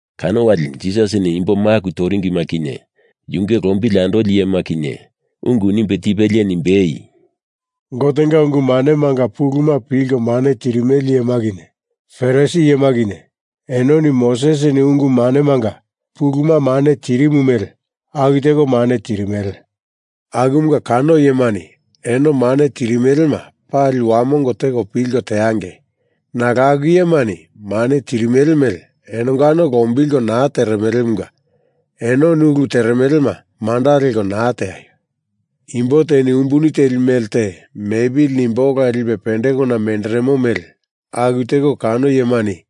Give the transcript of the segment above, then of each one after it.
Kano wali Jisasini imbo maku toringima kinye, yunge lombili andoli iyema kinye, ungu nimbe tipelie nimbei, “Gotenga ungu manemanga puluma pilko mane tirimele iyema kinye Farisi iyema kinye enoni Mosesini ungu manemanga puluma mane tirimu mele aku teko mane tirimele. Akumunga kano iyemani eno mane tirimelema pali wamongo teko pilko teangei, nalo aku iyemani mane tirimele mele enongano lombilko naa teremelemunga enoni ulu teremelema manda leko naa teaio. Imbo teni umbuni teli mele te mepili nimbe ola lipe pendekona menderemo mele aku teko kano iyemani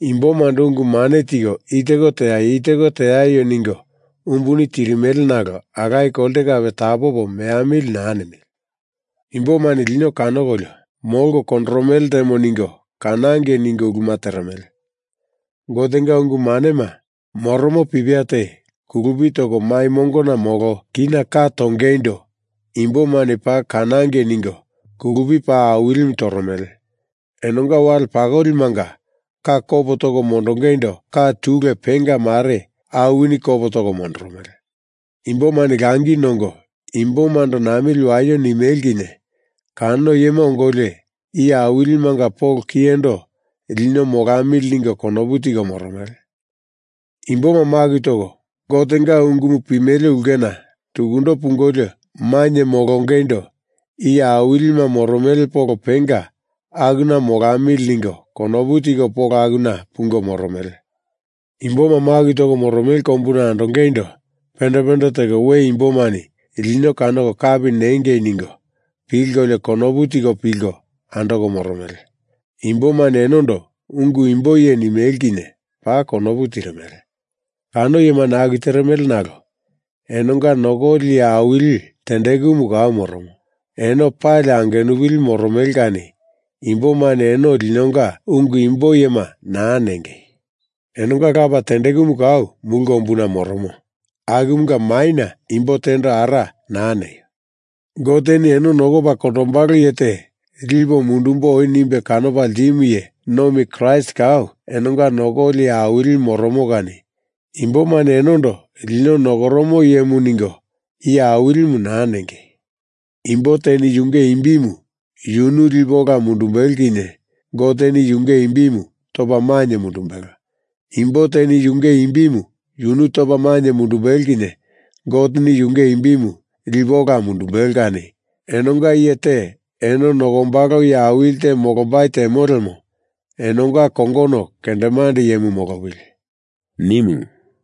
imbomando ungu mane tiko i teko teaio, i teko teaio ningo umbuni tirimele nalo alaye kolte kape tapopo meamili naa nimele. Imbomani lino kanokolio molko kondoromele ltemo ningo kanangei ningo uluma teremele. Gotenga ungu manema moromo pipia te kulupi toko mai mongona molo kina ka tongeindo imboma paa kanangei ningo kulupi paa awilimu toromele. Enonga wale pakolimanga ka kopo toko mondongeindo ka tule penga mare awini kopo toko mondoromele. Imbomani langi nongo imbomando namili waio nimele kinye kano iyema ongolio iye awilimanga polo kiyendo lino molamili ningo konopu tiko moromele. Imboma maku toko Gotenga ungumu pimele ulkena tukundo pungolio mainye molongeindo iye awilima moromele polo penga akuna molamili ningo konopu tiko polo akuna pungo moromele. Imboma maku toko moromele kombuna andongeindo pende pende teko we imbomani lino kanoko kapi nengei ningo pilkolio konopu tiko pilko andoko moromele. Imbomani enondo Ungu Imbo Iye nimele kinye paa konopu tirimele. Kano iyemani aku teremele nalo enonga nokoli iye awili tendekumu kau moromo, eno pali angenupili moromele kani imbomani eno linonga Ungu Imbo Iyema naa nengei. Enonga Lapa tendekumu kau mulu kombuna moromo, akumunga maina imbo tendo Ara naa neio. Goteni eno nokopa kondombalo iye te lipo mundumbo oi nimbe kanopa ltimu iye nomi Kraist kau enonga nokoli iye awilimu moromo kani imbomani enondo lino nokoromo iyemu ningo iye awilimu naa nengei. Imbo teni yunge imbimu yunu lipe ola mundumbelo kinye Goteni yunge imbimu topa mainye mundumbelo; imbo teni yunge imbimu yunu topa mainye mundumbelo kinye Goteni yunge imbimu lipe ola mundundumbelo kani enonga iye te eno nokombalo iye awili te molombai temo lemo enonga kongono kendemande iyemu molopili,” nimu.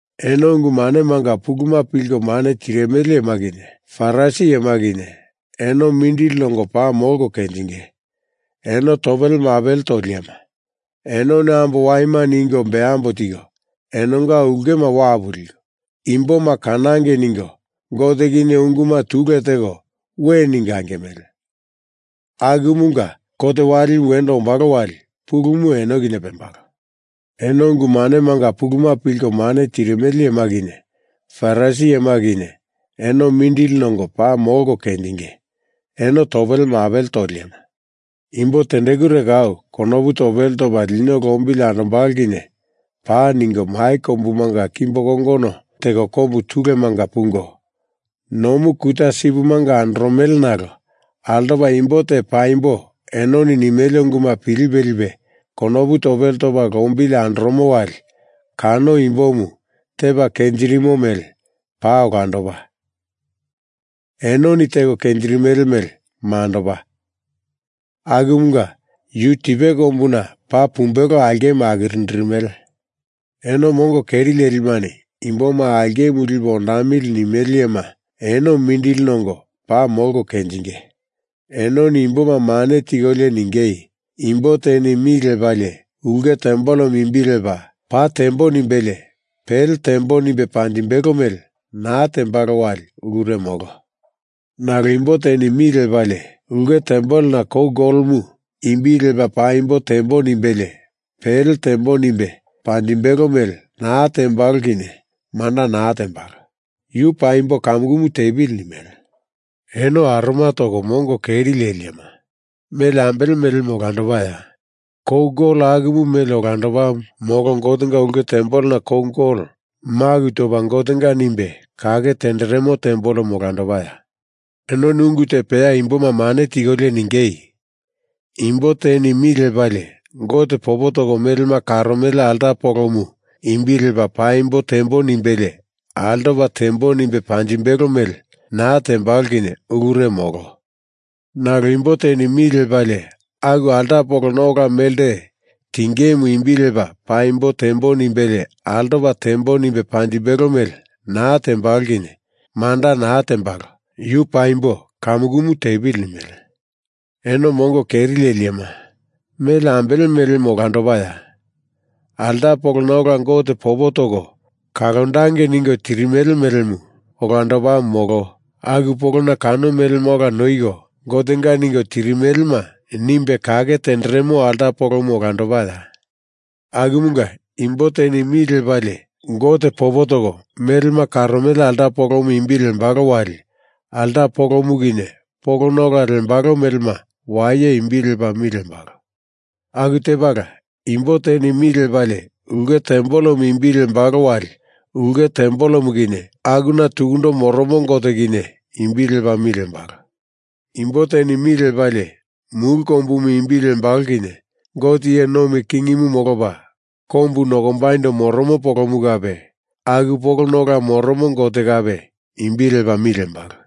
Eno ungu manemanga puluma pilko mane tirimele iyema kinye Farisi iyema kinye eno mindili nongo paa molko kenjinge! Eno topele mapele toli iyema! Enoni ambo waima ningo bembo tiko enonga ulkema wapu liko, imboma kanangei ningo Gote kinye unguma tule teko we ningo angimele, akumunga kot walimu wendo ombalo wali pulumu eno kinye pembalo. Eno ungu manemanga puluma pilko mane tirimele iyema kinye Farisi iyema kinye eno mindili nongo paa molko kenjinge! Eno topele mapele toli iyema! Imbo tendekure kau konopu topele topa lino lombili andombalo kinye paa, ningo mai kombumanga kimbo kongono teko kombu tulemanga pungo, nomu kuta sipimanga andoromele nalo altopa imbo te paimbo enoni nimele unguma pilipe lipe konopu topele topa lombili andoromo wali kano imbomu tepa kenjirimo mele paa olandopa, enoni teko kenjirimele mele mandopa, akumunga yu tipe kombuna paa pumbelo aulkemu akirindirimele. Eno mongo keri lelimani imboma aulkemu lipo ondamili nimele iyema eno mindili nongo paa molko kenjinge! Enoni imboma mane tikolio ningei, ‘Imbo teni mi lepalie ulke tempelemu imbi lepa paa tembo nimbelie pele tembo nimbe panjimbelo mele naa tembalo wali ulure molo. Nalo imbo teni mi lepalie ulke tempelena kou golomu imbi lepa paimbo tembo nimbelie pele tembo nimbe panjimbelo mele naa tembalo kinye manda naa tembalo. Yu paimbo kamukumu tepili,’ nimele. Eno aroma toko mongo keri leli iyema! Mele ambele melemu olandopaya? Kou gol akumu mele olandopamu molo Gotenga ulke tempelena kou gol maku topa Gotenga nimbe kake tenderemo tempelemu olandopaya? Enoni ungu te peya imboma mane tikolio ningei, ‘Imbo teni mi lepalie Gote popo toko melema karomele alta polomu imbi lepa paimbo tembo nimbelie altopa tembo nimbe panjimbelo mele naa tembalo kinye ulure molo. Nalo imbo teni mi lepalie aku alta polona ola melte tingemu imbi lepa paimbo tembo nimbelie altopa tembo nimbe panjimbelo mele naa tembalo kinye manda naa tembalo. Yu paimbo kamukumu tepili,’ nimele. Eno mongo keri leli iyema! Mele ambele melemu olandopaya? Alta polona ola Gote popo toko kalondangei ningo tirimele melemu olandopamu molo aku polona kano melema ola noiko Gotenga ningo tirimelema nimbe kake tenderemo alta polomu olandopaya? Akumunga, imbo teni mi lepalie Gote popo toko melema karomele alta polomu imbi lembalo wali alta polomu kinye polona ola lembalo melema waye imbi lepa mi lembalo. Aku tepala imbo teni mi lepalie ulke tempelemu imbi lembalo wali ulke tempelemu kinye akuna tukundo moromo Gote kinye imbi lepa mi lembalo. Imbo teni mi lepalie mulu kombumu imbi lembalo kinye Gote iye nomi kingimu molopa kombu nokombaindo moromo polomu kape aku polona ola moromo Gote kape imbi lepa mi lembalo.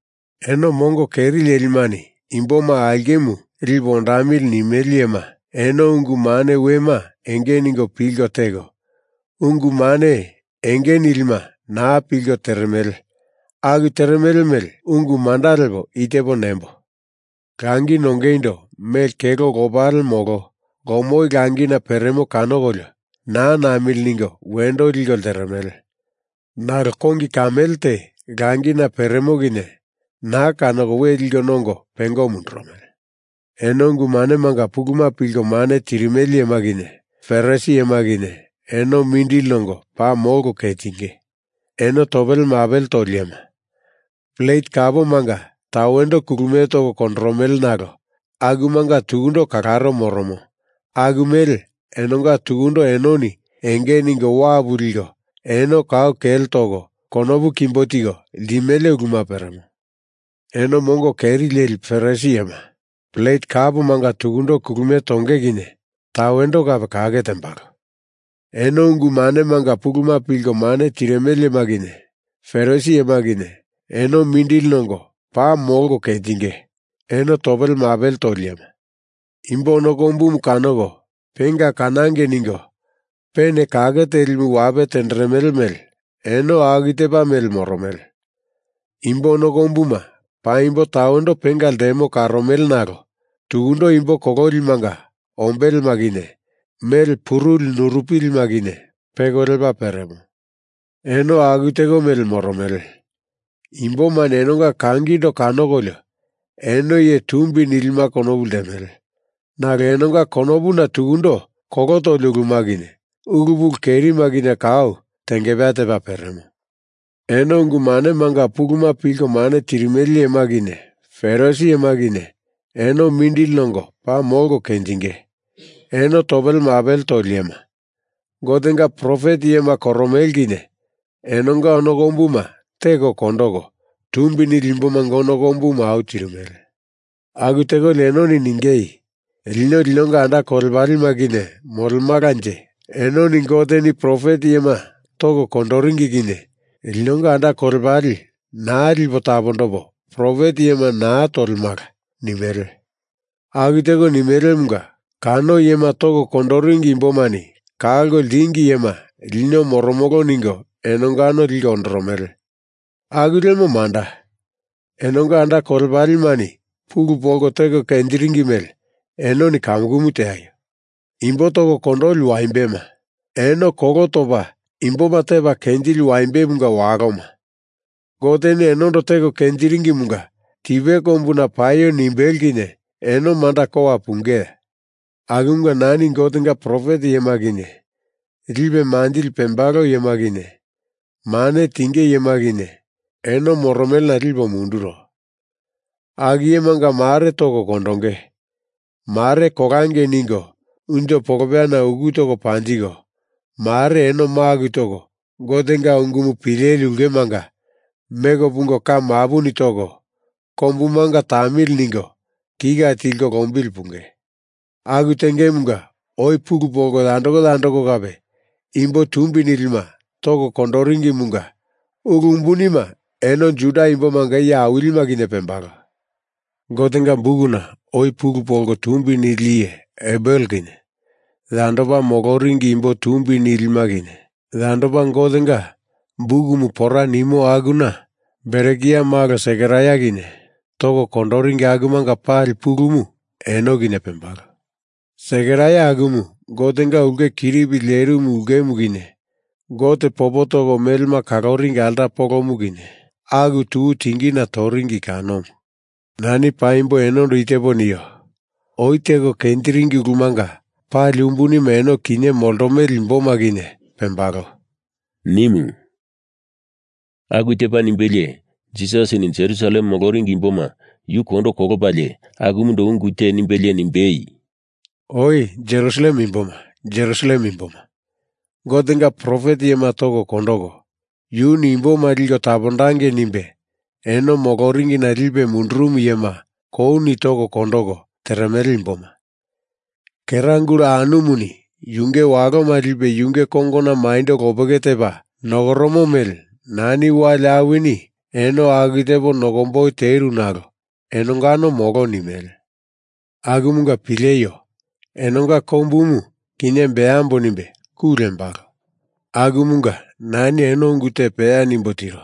Eno mongo keri lelimani imboma aulkemu lipo ondamili nimele iyema, eno ungu mane wema enge ningo pilko teko, ungu mane enge nilima naa pilko teremele aku teremele mele ungu manda lepo i tepo nembo. Langi nongeindo mele kelo lopale molo lomoi langina peremo kanokolio naa namili ningo wendo liko lteremele, nalo kongi kamele te langina peremo kinye naa kanoko we liko nongo pengo mundurumele. Eno ungu manemanga puluma pilko mane tirimele iyema kinye Farisi iyema kinye, eno mindili nongo paa molko kenjinge! Eno topele mapele toli iyema! Plet kapomanga tawendo kulumie toko kondoromele nalo akumanga tukundo kalaro moromo aku mele enonga tukundo enoni enge ningo wapu liko, eno kau kele toko konopu kimbo tiko limele uluma peremo. Eno mongo keri leli Farisi iyema! Plet kapomanga tukundo kulumie tonge kinye tawendo kape kake tembalo. Eno ungu manemanga puluma pilko mane tirimele iyema kinye Farisi iyema kinye, eno mindili nongo paa molko kenjinge! Eno topele mapele toli iyema! Imbo ono kombumu kanoko penga kanangei ningo pena kake telimu wape tenderemele mele eno aku tepa mele moromele. Imbo ono kombuma paimbo tawendo penga ltemona karomele nalo tukundo imbo kololimanga ombelema kinye mele puruli nurupilima kinye peko lepa peremo. Eno aku teko mele moromele. Imbomani enonga kangindo kanokolio eno iye tumbi nilima konopu ltemele nalo enonga konopuna tukundo kolo toli uluma kinye ulu pulu kerima kinye kau tengepeya tepa peremo. Eno ungu manemanga puluma pilko mane tirimele iyema kinye Farisi iyema kinye eno mindili nongo paa molko kenjinge! Eno topele mapele toli iyema! Gotenga profet iyema koromele kinye enonga ono kombuma teko kondoko, tumbi nili imbomanga ono kombuma au tirimele. Aku tekolio enoni ningei, ‘Lino linonga anda kolepalema kinye molemalanje enoni Goteni profet iyema toko kondoringi kinye linonga anda kolepale naa lipo tapondopo profet iyema naa tolemala,’ nimele. Aku teko nimelemunga kano iyema toko kondoringi imbomani kalko ltingi iyema lino moromolo ningo enongano liko ondoromele. Aku lemo manda, enonga anda kolepalemani pulu polko teko kenjiringi mele enoni kamukumu teaio. Imbo toko kondoli waimbema! Eno kolo topa imboma tepa kenjili waimbemunga waloma! Goteni enondo teko kenjiringimunga tipe kombuna paio nimbelo kinye eno manda kowa pungeya? Akumunga nani Gotenga profet iyema kinye, lipe manjili pembalo iyema kinye, mane tinge iyema kinye, eno moromelena lipo munduro. Aku iyemanga mare toko kondoko, mare kolangei ningo unjo polopeyana uku toko panjiko, mare eno maku toko Gotenga ungumu pileli ulkemanga meko pungo ka mapuni toko, kombumanga tamili ningo kika tilko lombili punge. Aku tengemunga oi pulu polko yandoko yandoko kape imbo tumbi nilima toko kondoringimunga ulu umbunima eno Juda imbomanga iye awilima kinye pembalo. Gotenga bukuna oi pulu polko tumbi nili iye Abel kinye, yandopa moloringi imbo tumbi nilima kinye, yandopa Gotenga bukumu pora nimo akuna Berekia malo Sekaraia kinye toko kondoringi akumanga pali pulumu eno kinye pembalo. Sekaraia akumu Gotenga ulke kiripi lerimu ulkemu kinye Gote popo toko melema kaloringi alta polomu kinye aku tuku tingina toringi kanomu. Nani paimbo enondo i tepo nio. Oi teko kenjiringi ulumanga pali umbunima eno kinye moltomele imboma kinye pembalo,” nimu. Aku tepa nimbelie Jisasini Jerusalem moloringi imboma yu kondo kolopalie akumundo ungu te nimbelie nimbei, “Oe Jerusalem imboma, Jerusalem imboma, Gotenga profet iyema toko kondoko, yuni imboma liko tapondangei nimbe eno moloringina lipe mundurumu iyema kouni toko kondoko teremele imboma, kera gula anumuni yunge waloma lipe yunge kongona maindo lopeke tepa nokoromo mele nani wali awini eno aku tepo nokomboi teru nalo enongano molo nimele. Akumunga pileio. Enonga kombumu, kinye beambo nimbe ku lembalo. Akumunga nani eno ungu te peya nimbo tiro,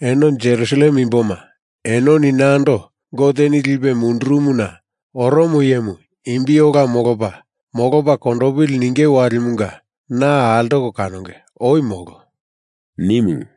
Eno Jerusalem imboma, enoni nando Goteni lipe mundurumuna oromo iyemu imbi ola molopa, molopa kondopili ninge walimunga na altoko kanonge. Oi molo,” nimu.